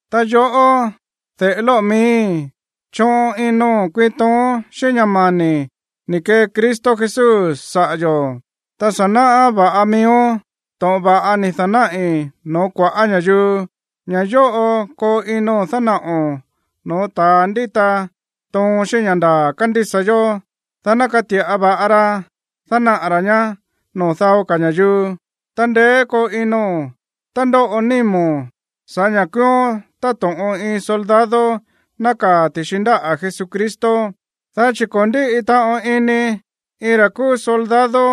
Ta yoꞌó, de̱ꞌe lóꞌo̱ miíi̱, choꞌon ino̱n kuiin tooón xíꞌín ña̱ mani̱ ni̱ kee Cristo Jesús saꞌa̱ yo̱. Ta sa̱ náꞌá va̱ꞌa miíón to̱ꞌon va̱ꞌa ni̱ da̱náꞌi̱ no̱ó kua̱ꞌá ña̱yuu. Ña̱ yóꞌo koo ino̱n dánaꞌo̱n no̱ó ta̱a ndíta toon xíꞌín ña̱ ndaa̱ kándísa yó, dá ná kati̱ꞌa va̱ꞌa ra dánaꞌa̱ ra̱ ñá noo̱ dao ka̱ ña̱yuu. Ta ndeé koo ino̱n tá ndóꞌo nímo̱n sa̱ꞌá ña̱ kúúón táto̱ꞌon iin soldado nákaa̱ ti̱xi ndáꞌa̱ Jesucristo. Dá chi̱ ko̱ ndíꞌi taꞌon ini iin ra̱ kúú soldado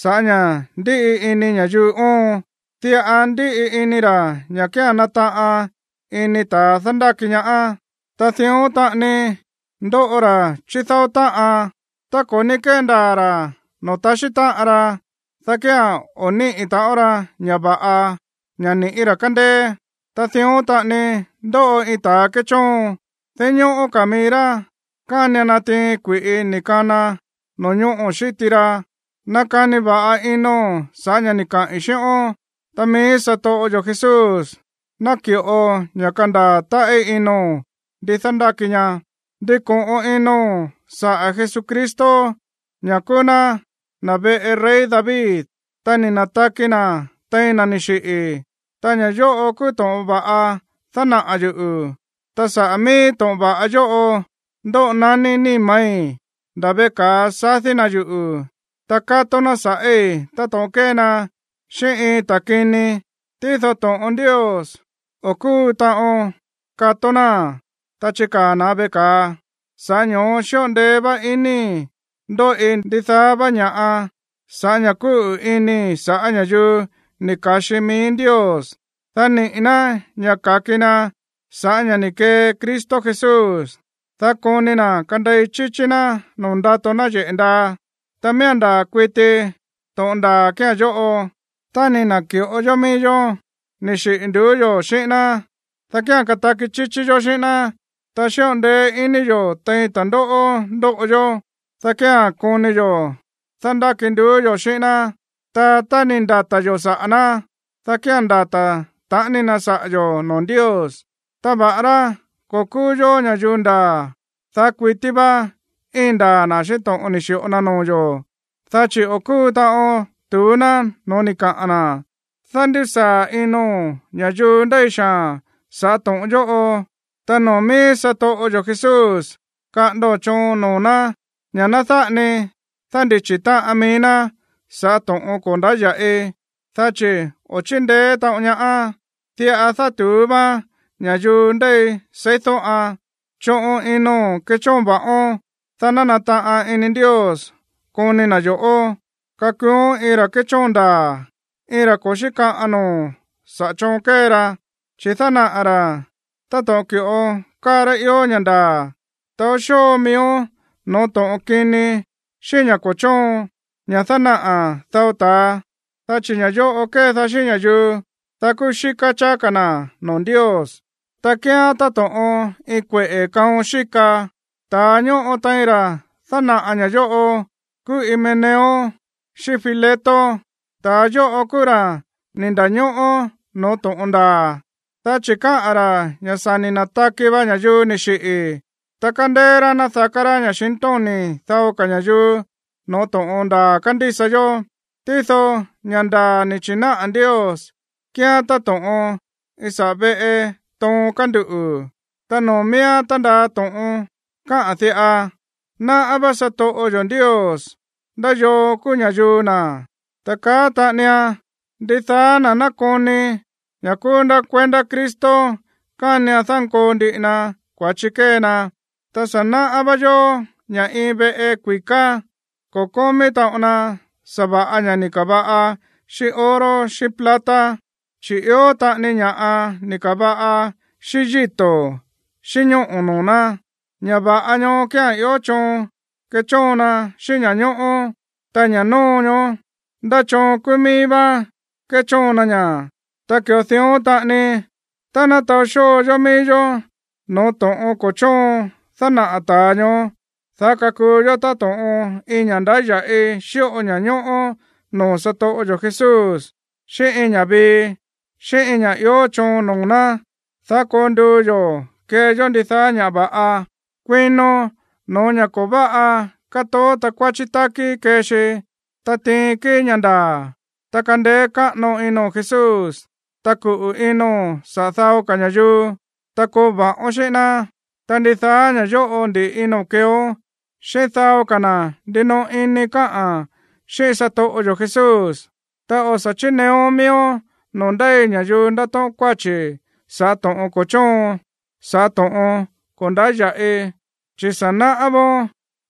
sa̱ꞌá ña̱ ndíꞌi ini ña̱yuu óon. Diꞌa ndíꞌi ini ra̱ ña̱ kía̱n nataꞌan ini ta̱ dándáki ñaá. Ta dión taꞌani ndóꞌo ra̱ chídáó táꞌan, tá ko̱ ní kéndaa̱ ra̱ noo̱ taxí táꞌan ra, dá kía̱n o̱ níꞌi̱ taꞌon ra ña̱ va̱ꞌa, ña̱ ni̱ꞌí ra̱ kándéé. Ta dión taꞌani ndóꞌo iin ta̱ kéchóon, dinñóꞌó ka̱ mií rá kánian natiin kui̱ꞌi ni̱ kana no̱ñóꞌo̱ xíti ra. Nakani va̱ꞌa ino̱n sa̱ꞌá ña̱ ni̱ kaꞌi̱n xíꞌón, ta mií satoꞌo yo̱ Jesús naki̱ꞌo ña̱ kandaa̱ táꞌí ino̱n ndi dándáki ña. Ndiko̱ꞌon ino̱n saꞌa̱ Jesucristo, ña̱ kúú ná na̱ veꞌe rey David, ta ni̱ na̱taki na̱ tein na̱ ni̱ xiꞌi̱. Ta ña̱ yóꞌo kúú to̱ꞌon va̱ꞌa dánaꞌa̱ yuꞌu̱. Ta saꞌa̱ mií to̱ꞌon va̱ꞌa yóꞌo ndóꞌo naní níma̱í, nda̱ veꞌe ka̱a sadí na̱ yuꞌu̱, ta kátó ná sa̱ꞌíi̱ táto̱ꞌon kée na xíꞌín iin ta̱ kini. Tído to̱ꞌon Ndios, o̱ kúu taꞌon kató náa̱n, ta chikaa̱ na̱ veꞌe ka̱a. Sa̱ꞌá ño̱ó xíꞌo ndeé vá inii̱ ndóꞌi ndidaá vá ña̱ꞌa sa̱ꞌá ña̱ kúꞌu̱ inii̱ saꞌa̱ ña̱yuu ni̱ ka̱xi mií Ndios, dá niꞌi̱ ná ña̱ ka̱ki na sa̱ꞌá ña̱ ni̱ kee Cristo Jesús, dá koni na̱ kandei chíchí ná noo̱ ndato náyeꞌe̱ ndaa. Ta miía̱n ndaa̱ kuiti to̱ꞌon ndaa̱ kía̱n yóꞌo: Tá ni̱ na̱ki̱ꞌo yó mií yó ni̱ xiꞌi̱ nduú yo̱ xíꞌín ná, dá kía̱n kataki chíchí yó xíꞌín ná. Tá xíꞌo ndeé ini yo̱ tein ta̱ndóꞌó ndóꞌo yó, dá kía̱n koni yo̱ dándáki nduú yo̱ xíꞌín ná. Ta tá ni̱ ndata̱ yo̱ saꞌa̱ ná, dá kía̱n ndata̱ taꞌani na saꞌa̱ yo̱ noo̱ Ndios. Ta va̱ꞌará ko̱ kúú yó ña̱yuu ndaa̱, daá kuití vá íin ndaa̱ na̱ xíꞌín to̱ꞌon ni̱ xi̱ꞌo na noo̱ yo̱, dá chi̱ o̱ kúu taꞌon tu̱ú ná no̱ó ni̱ kaꞌa̱n na̱. Dándisaa̱ ino̱n ña̱yuu ndéi xaa̱n sa̱ꞌá to̱ꞌon yóꞌo, ta noo̱ mií satoꞌo yo̱ Jesús kaꞌa̱ndo̱n choon noo̱ ná ña̱ ná dáꞌa ni dándichi̱ táꞌan mií ná sa̱ꞌá to̱ꞌon ko̱ ndáya̱ꞌi, dá chi̱ o̱ chíndeé taꞌon ñaá. Diꞌa dátu̱ú váán ña̱yuu ndéi seídóꞌan. Choꞌon ino̱n kechóon va̱ꞌón, dá ná nataꞌan ini Ndios koni na̱ yo̱ꞌó. Kakuuón iin ra̱ kéchóon ndaa̱, iin ra̱ ko̱ xíkaꞌan noo̱ saꞌa̱ choon kée ra, chi̱ dánaꞌa̱ ra̱ táto̱ꞌon ki̱ꞌo káa rá ió ña̱ ndaa̱. Taó xóo miíón no̱ó to̱ꞌon kini xíꞌín ña̱ ko̱ chóon, ña̱ dánaꞌa̱ dao ta̱a, dá chi̱ ña̱ yóꞌo kédaá xíꞌín ña̱yuu, dá kuxíká cháá ka̱ na̱ noo̱ Ndios, ta kíán táto̱ꞌon iin kueꞌe̱ kaon xíka. Ta̱a ñóꞌo tein ra̱ dánaꞌa̱ ña̱ yóꞌo kúú Himeneo xíꞌín Fileto. Ta̱a yóꞌo kúú ra̱ ni̱ nda̱ñóꞌó no̱ó to̱ꞌon ndaa̱, dá chi̱ káꞌa̱n ra̱ ña̱ sa̱ ni̱ na̱taki va ña̱yuu ni̱ xiꞌi̱, ta kándeé rá nadaká rá ña̱xintóni̱ dao ka̱ ña̱yuu no̱ó to̱ꞌon ndaa̱ kándísa yó. Tído ña̱ ndaa̱ ni̱ chi̱náꞌa̱ Ndios kíán táto̱ꞌon iin saꞌa̱ véꞌe toon kánduꞌu̱, ta noo̱ miíán tándaa to̱ꞌon káꞌa̱n diꞌa: “Náꞌá vá satoꞌo yo̱ Ndios ndá yoo kúú ña̱yuu na̱.” Ta kaá taꞌanian: “Ndidaá na̱ nákoni ña̱ kúú ná kuendá Cristo kánian dánkoo ndiꞌi na kua̱chi kée na.” Ta sa̱ náꞌá va̱ꞌa yó ña̱ iin veꞌe kui̱ká, ko̱ kómí taꞌon na sa̱va̱ꞌa ña̱ꞌa ni̱ ka̱va̱ꞌa xíꞌín oro xíꞌín plata, chi̱ ió taꞌani ña̱ꞌa ni̱ ka̱va̱ꞌa xíꞌín yíto̱ xíꞌín ñóꞌo̱ noo̱ ná. Ña̱ va̱ꞌa ñoó kía̱n ió choon kéchóon na xíꞌín ña̱ñóꞌó. Ta ña̱ nóo ñoó, ndá choon kúú mií vá kéchóon na ña̱. Ta ki̱ꞌo dión taꞌani, tá ná taó xóo yó mií yó no̱ó to̱ꞌon ko̱ chóon dánaꞌa̱ ta̱a ñoó, dá kakuu yó táto̱ꞌon iin ña̱ꞌa ndáya̱ꞌi xíꞌo ña̱ñóꞌó noo̱ satoꞌo yo̱ Jesús, xíꞌín iin ña̱ꞌa vii, xíꞌín iin ña̱ꞌa ió choon noo̱ ná, dá koo nduu yo̱ kee yó ndidaá ña̱ va̱ꞌa. Kuino no̱ó ña̱ ko̱ váꞌa kátoó takuáchí tákí kée xi. Ta tiin kíi̱ ña̱ ndaa̱, ta kandeé káꞌano ino̱n Jesús, ta kuꞌu̱ ino̱n saꞌa̱ dao ka̱ ña̱yuu, ta koo va̱ꞌón xíꞌín ná. Ta ndidaá ña̱ yóꞌo ndi̱ꞌi ino̱n keeón xíꞌín dao ka̱ na̱ ndinoꞌo ini káꞌa̱n xíꞌín satoꞌo yo̱ Jesús. Ta o̱ sa̱ chíneeón miíón noo̱ ndéi ña̱yuu ndatóꞌón kuáchi̱ saꞌa̱ to̱ꞌon ko̱ chóon, saꞌa̱ to̱ꞌon ko̱ ndáya̱ꞌi, chi̱ sa̱ náꞌá vóón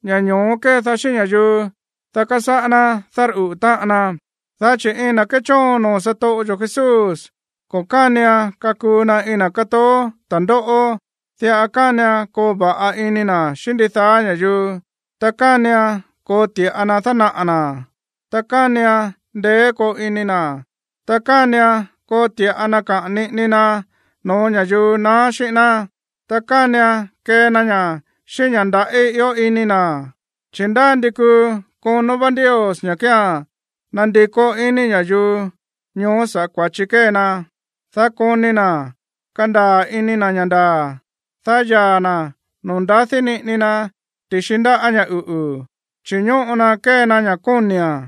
ña̱ ño̱ó kédaá xíꞌín ña̱yuu, dá kasáꞌá ná dárꞌuꞌu̱ táꞌan na. Dá chi̱ iin na̱ kéchóon noo̱ satoꞌo yo̱ Jesús, ko̱ kánian kakuu na iin na̱ kátoó ta̱ndóꞌó. Diꞌa kánian koo va̱ꞌa ini na̱ xíꞌín ndidaá ña̱yuu, ta kánian koo ti̱ꞌa na dánaꞌa̱ na̱, ta kánian ndeé koo ini na̱. Ta kánian koo ti̱ꞌa na kaꞌa̱n niꞌini na no̱ó ña̱yuu na̱á xíꞌín ná, ta kánian kee na ña̱ xíꞌín ña̱ ndaꞌí ió ini na̱, chi̱ ndá ndi kuu konó vá Ndios ña̱ kía̱n nandikó iní ña̱yuu ñoó sa̱ꞌá kua̱chi kée na, dá koni na̱ kandaa̱ ini na̱ ña̱ ndaa̱, dá yaa̱ na̱ noo̱ ndadí niꞌini na ti̱xi ndáꞌa̱ ña̱ uꞌu̱, chi̱ ñóꞌo na kée na ña̱ kóni̱a̱n.